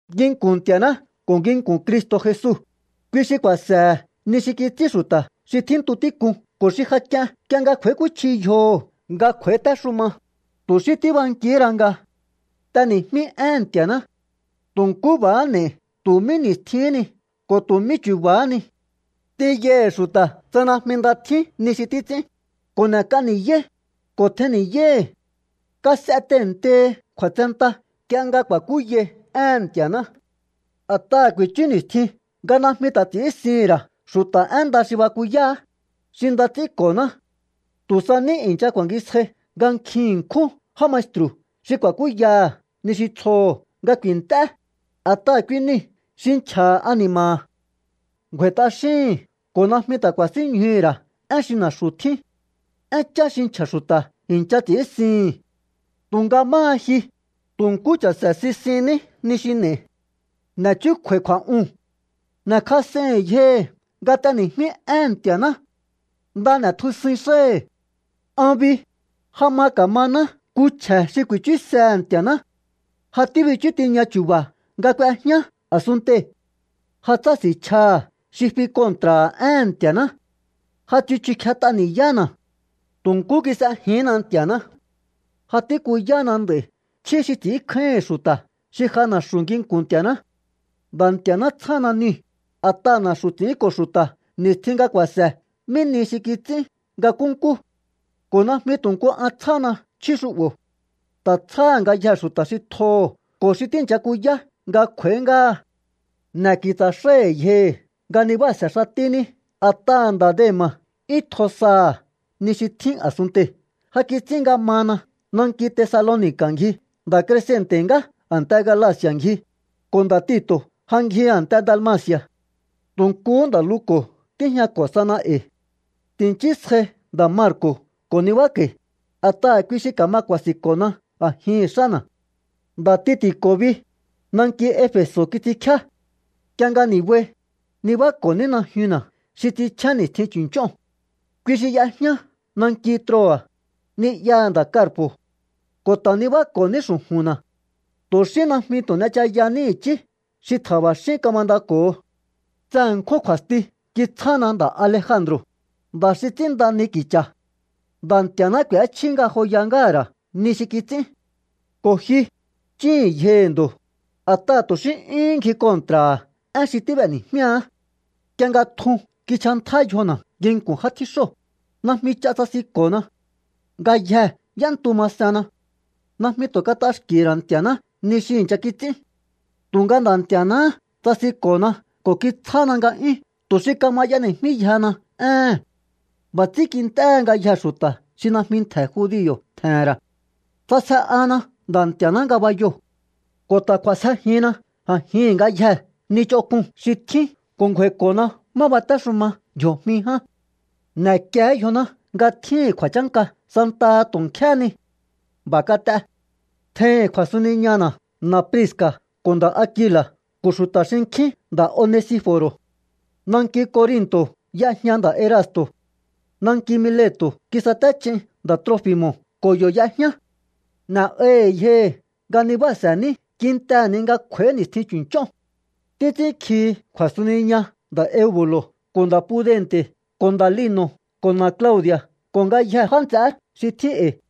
Nginku̱n Nti̱a̱ná ko̱ nginku̱n Cristo̱ Jesu, kui xi ku̱a̱se̱he̱ ni xi kits'ín xu̱ta̱ xi tjíntu tík'un ko̱ xi ja k'ien nk'ie nga kj'u̱a̱íkúchji yjoho̱ nga kj'u̱a̱ítéxuma, tu̱ xí tíbankihí ra nga t'eni̱jmí éhe̱n Nti̱a̱ná. Tu̱ nkú b'a̱há n'e̱i̱ tu̱ mí ni̱stjihín ni ko̱ tu̱ mí chu̱ba̱há ni. T'inyaihi̱ xu̱ta̱ tsa najmi nda tjín ni xi títs'ín, ko̱ n'e̱k'a ni̱yáí, ko̱ tjennni̱yáíhi̱. Kas'e tehe̱ntehi kju̱a̱tsenta nk'ie nga ku̱a̱kúyai éhe̱n Nti̱a̱ná. A̱t'aha̱ ku̱i̱chú ni̱stjin nga najmi ta̱ ts'i̱ínsihi̱n ra̱ xu̱ta̱ én nda xi bakuyáá, xi nda ts'ínko̱ná. Tu̱ sa ní i̱ncha ku̱a̱ngisjai nga nkjin ṉkjún já maestru̱ xi ku̱a̱kúyaha̱ ni xi tsjoho̱ nga ku̱i̱nt'é, a̱t'aha̱ kui niu̱ xi nchja̱ha̱ ani̱ma̱ha̱. Ngju̱a̱i̱ t'axíhi̱n ko̱ najmi ta̱ ku̱a̱sínñjuhu̱ ra̱ én xi na̱xu̱ tjín. Énchá xi nchja̱ xu̱ta̱ i̱ncha ts'i̱ínsihi̱n. Tu̱nga máha ji, tu̱ nkú cha̱se̱ sisinní ni xi n'e̱i. N'e̱ chúkju̱a̱i kju̱a̱'uu̱n. N'e̱kjas'eihi̱n yjohi̱ nga t'eni̱jmí éhe̱n Nti̱a̱ná. Nda n'e̱tjusuin xáhi̱. An bi, ja ma ka̱maná nku chje̱ xi ku̱i̱chúsehe̱ Nti̱a̱ná. Ja tíbichú tiña chu̱ba̱ nga k'uejñá a̱sunntei̱. Ja tsási̱nchjaha̱ xi fi kontra̱ha̱ éhe̱n Nti̱a̱ná. Ja tsichu kjet'a ni̱yána̱. Tu̱ nkú kis'ejihínna Nti̱a̱ná. Ja tíkuyána nd'a̱i̱ chjí xi ts'i̱ínkjáíhi̱n xu̱ta̱ xi ja na̱xu̱ nginku̱n Nti̱a̱ná. Nda̱ Nti̱a̱ná tsjána niu̱, a̱t'aha̱ na̱xu̱ ts'i̱ínko̱ xu̱ta̱ ni̱stjin nga ku̱a̱se̱ mí nihi xi kits'ín nga nkúnkú. Ko̱ najmi tu̱ nku an tsjána chjí xu'bo̱. Ta̱ tsjáha̱ ngayjee̱ xu̱ta̱ xi tjoho̱ ko̱ xi tíi̱ncha kuyá nga kj'u̱a̱í ngáha. N'e̱ ki̱tsa̱ xáíhi̱ yjohi̱ nga nibáa̱se̱ xatíní. A̱t'aha̱ nda̱ Dema̱ 'yún tjo saha̱ ni xi tjín a̱sunntei̱. Ja kits'ín nga mana. Nanki Tesaloni̱ka̱ ngji. Nda̱ Krescente̱ ngá a̱nte Galaci̱a̱ ngji, ko̱ nda̱ Tito̱ ja ngji a̱nte Dalmaci̱a̱. Tu̱ nkuhú nda̱ Luko̱ tíjñako̱ sana e̱i̱. Ti̱nchísjai nda̱ Marko̱ ko̱ nibáko̱i̱, a̱t'aha̱ kui xi ka̱ma ku̱a̱si̱nko̱na a̱jihi̱n xána̱. Nda̱ Tiki̱ko̱ bi, nanki Efe̱so̱ kits'inkjíá. Nk'ie nga ni̱bai, nibáko̱ní najyunna̱ xi ts'inchjén ni̱stjin chu̱nch'óo̱n. Kui xi y'ejñá nanki Troa̱, ni'yaha̱ nda̱ Karpo̱. Ko̱ ta̱ nibáko̱ní xu̱ju̱nna̱. Tu̱ xí najmi tu̱ n'echayaní i̱chí xi tja̱ba̱xín kamandako̱ho. Tse ṉkjún kju̱a̱sti kitsjáná nda̱ Alejandro̱, nda̱ xi ts'ínnda ni ki̱cha̱. Nda̱ Nti̱a̱ná k'u̱échjí ngajoya ngáha̱ ra̱ ni xi kits'ín. Ko̱ ji, chíhi̱n yjohi̱ ndo̱, a̱t'aha̱ tu̱ xí 'yúhún ngji kontra̱ha̱ én xi tíb'eni̱jmíaá. Nk'ie nga tjun kinchjantjá yjona̱ nginku̱n já tjíxóo̱, najmi ch'a tsasinko̱na. Ngayjee̱ y'éntu masenna. Najmi tu̱ kat'axki̱hi̱ ra̱ Nti̱a̱ná ni xi i̱ncha kits'ín. Tu̱nga Nda̱ Nti̱a̱náhá tsasinko̱na ko̱ kitsjána nga'yún tu̱ xi kama y'eni̱jmíyjehena éhe̱n. B'a̱ ts'ín kint'éhe ngayjee̱ xu̱ta̱ xi najmi ntje̱ judio̱ tje̱he̱n ra̱. Ts'asje'ana Nda̱ Nti̱a̱ná ngabayoo̱. Ko̱ ta̱ k'u̱a̱sjejinna a̱jihi̱n ngayjee̱ ni ch'onk'un xi tjín ko̱ ngju̱a̱i̱ko̱na má batéxuma ndji̱o̱jmi ján. ¡N'e̱kié yjoná nga tjíhi̱n kju̱a̱chánka santaha tu̱ nkjéhé ni! B'a̱ kat'e. Tjeihi̱n kju̱a̱suniñana̱ na Priska̱ ko̱ nda̱ Akila̱ ko̱ xu̱ta̱ xinkjín nda̱ Onesifo̱ro̱. Nanki Corinto̱ y'ejña nda̱ Erasto̱. Nanki Mileto̱ kisatéch'in nda̱ Trofi̱mo̱ ko̱ yo̱ y'ejñá. N'e̱'ahi̱ yjohi̱ nga nibáa̱se̱ní kintehe̱ ni nga kj'u̱a̱í ni̱stjin chu̱nch'óo̱n. Títs'ínkjihi kju̱a̱suniña nda̱ Eubu̱lo̱ ko̱ nda̱ Pudente̱ ko̱ nda̱ Lino̱ ko̱ na Claudi̱a̱ ko̱ ngayjee̱ já nts'eé xi tjín e̱i̱.